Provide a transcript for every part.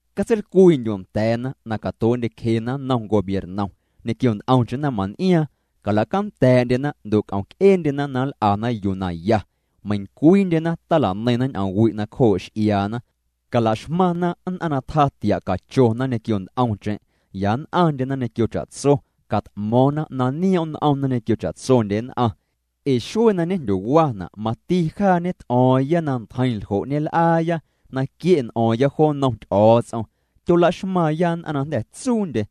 Catseilcwii'ndyu' nda̱a̱na na catuee'ndyecjena nnom gobiernom ñequio nt'omcheⁿ naⁿman'iaaⁿ, calacanda̱a̱'ndyena ndo' c'omc'eendyena na nl'ana yuu naya. Meiⁿcwiindyena tala'neiⁿna ñ'oomwi' nacjoo' x'iaana. Calaxmaⁿna nn'aⁿ na tjatia' cachona ñequio nt'omcheⁿ, ya nn'aⁿndyena ñequio cha'tso. Cat'mo̱o̱ⁿna na nioom' n'omna ñequio cha'tsondye nn'aⁿ. Ee xuee na ñejndyowana' mati jaa ñet'o̱o̱ⁿya na ntjeiⁿ ljo' ñel'aaya, na quie' n'o̱o̱ⁿya jo nnom Ty'o̱o̱ts'om. Tyolaxmaaⁿya nn'aⁿ na jnda̱ tsuundye.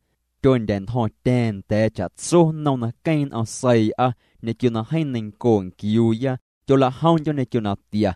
Tyondya̱'ntjo̱ⁿtya̱a̱ⁿ nda̱a̱ cha'tso nnom na queeⁿ n'om seii'a ñequio na jeeⁿ neinco nquiuuya. Tyolajomndyo̱ ñequio natia.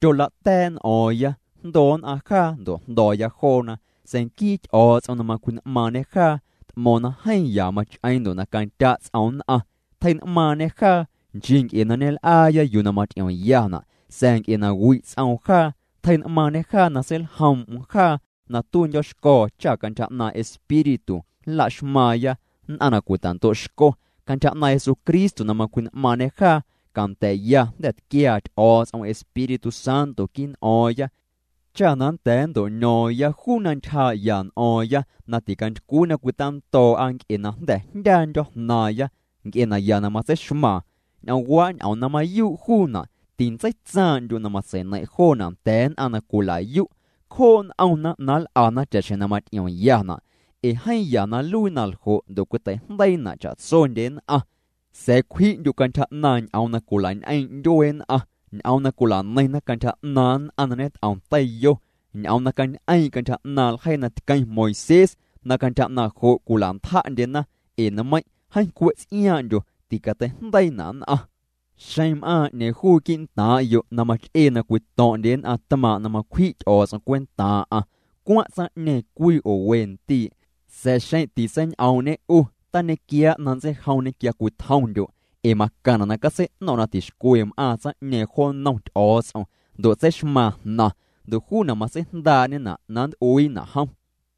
Tyolata̱a̱' n'o̱o̱ⁿya, jndoo nn'aⁿ jaa ndo' jndo̱o̱ya joona. Sa̱a̱ nquii Ty'o̱o̱ts'om na macwji'n'maaⁿñê jaa, t'mo̱o̱ⁿ na jeeⁿ ya mach'eeⁿ ndo' na candya' ts'oom nn'aⁿ, tjei'n'maaⁿñê jaa, nchii nc'e na ñel'aaya yuu na maty'iomyana', sa̱a̱ nc'e na wi' ts'oom jaa. Tjei'n'maaⁿñê jaa na seiljoom'm jaa na tuiindyo̱xco̱o̱ cha cantyja 'naaⁿ' Espíritu nlaxmaaⁿya nn'aⁿ na cwita'ndo' xco. Cantyja 'naaⁿ' Jesucristo na macwji'n'maaⁿñê jaa, canda̱a̱'ya jnda̱ tquiaa Ty'o̱o̱ts'om Espíritu Santo quii' n'o̱o̱ⁿya, cha na nnda̱a̱ nnto'ño̱o̱ⁿya juu na ntyjaa'ya n'o̱o̱ⁿya na ticantycwii na cwitando̱o̱'a nc'e na jnda̱ jndyaandyo̱ jnaaⁿya nc'e naya na matseixmaaⁿ. Ñ'oomwaa' ñ'oom na mayuu' juuna', tintseitsaaⁿ'ndyu' na matseineiⁿ' joona' nda̱a̱ nn'aⁿ na cwila'yu'. Cjoo' n'omna na nl'ana cha'xjeⁿ na maty'iomyana' ee jeeⁿ ya na nluii naljo' ndo' cwitei'jndeiina' cha'tsondye nn'aⁿ. Sa̱a̱ cwji'ndyu' cantyja 'naaⁿ ñ'oom na cwila'ñ'eeⁿ' ndyuee nn'aⁿ, ñ'oom na cwilaneiⁿna cantyja 'naaⁿ nn'aⁿ na ñet'om teiyo, ñ'oom na cañ'eeⁿ' cantyja 'naaⁿ' ljeii na tqueⁿ Moisés na cantyja 'naaⁿ' jo' cwila'ntja'ndyena, ee nmeiⁿ' jeeⁿ cwe' ts'iaaⁿ'ndyo, ticateijndeiina' nn'aⁿ. Xeⁿ na m'aaⁿ 'ñeeⁿ juu quii' ntaaⁿ'yo' na mach'ee na cwito̱ⁿ'ndye nn'aⁿ tmaaⁿ' na macwji' Ty'o̱o̱ts'om cwentaaⁿ'aⁿ, cwaⁿ' tsaⁿñeeⁿ cwii oo we ndii', sa̱a̱ xeⁿ titseiñ'oom'ñê 'u, tañequiaa' na nntseijomñê quia cwitjomndyo', ee macaⁿna' na catsei'no̱ⁿ' na tixcwe m'aaⁿ tsaⁿ'ñeeⁿ jo nnom Ty'o̱o̱ts'om ndo' tseixmaaⁿ jnaⁿ, ndo' juuna' matseijndaa'ñena' na nnt'uiina' jom.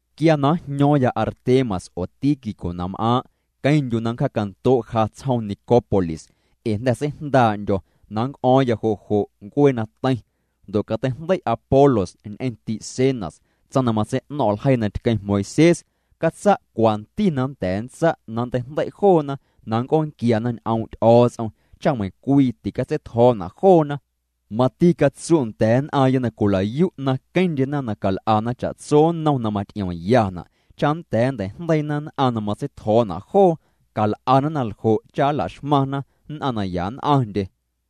Quia na njño̱o̱ⁿya Artemas oo Tíquico na m'aaⁿ', queⁿndyu' na nncja'ndo' ja tsjoom Nicópolis, ee jnda̱ seijndaa'ndyo̱ na nnc'o̱o̱ⁿya jo' jo' ncuee na teiⁿ. Ndo' cateijndei' Apolos ñ'eⁿ ti'Zenas, tsaⁿ na matsei'no̱ⁿ' ljeii na tqueⁿ Moisés. Catsa' cwanti na nnda̱a̱ nntsa' na nnteijndei' joona na nnc'oonquiana ñ'oom' Ty'o̱o̱ts'om, cha meiⁿcwii ticatseitjo̱o̱na' joona. Mati catsu' nda̱a̱ nn'aaⁿya na cwila'yu' na queⁿndyena na cal'ana cha'tso nnom na maty'iomyana' cha nnda̱a̱ nntei'jndeiina nn'aⁿ na matseitjo̱o̱na' joo. Cal'ana na ljo' cha nlaxmaⁿna nn'aⁿ na ya nn'aⁿndye.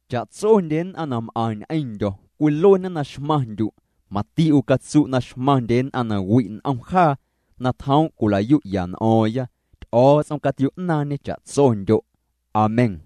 Cha'tsondye nn'aⁿ na m'aⁿ ñ'eⁿndyo̱ cwiluena na xmaⁿndyu'. Mati 'u catsu' na xmaⁿndye nn'aⁿ na wi' n'om jaa na tjoom' cwila'yu'ya n'o̱o̱ⁿya. Ty'o̱o̱ts'om catio'naaⁿñê cha'tsondyo'. Amén.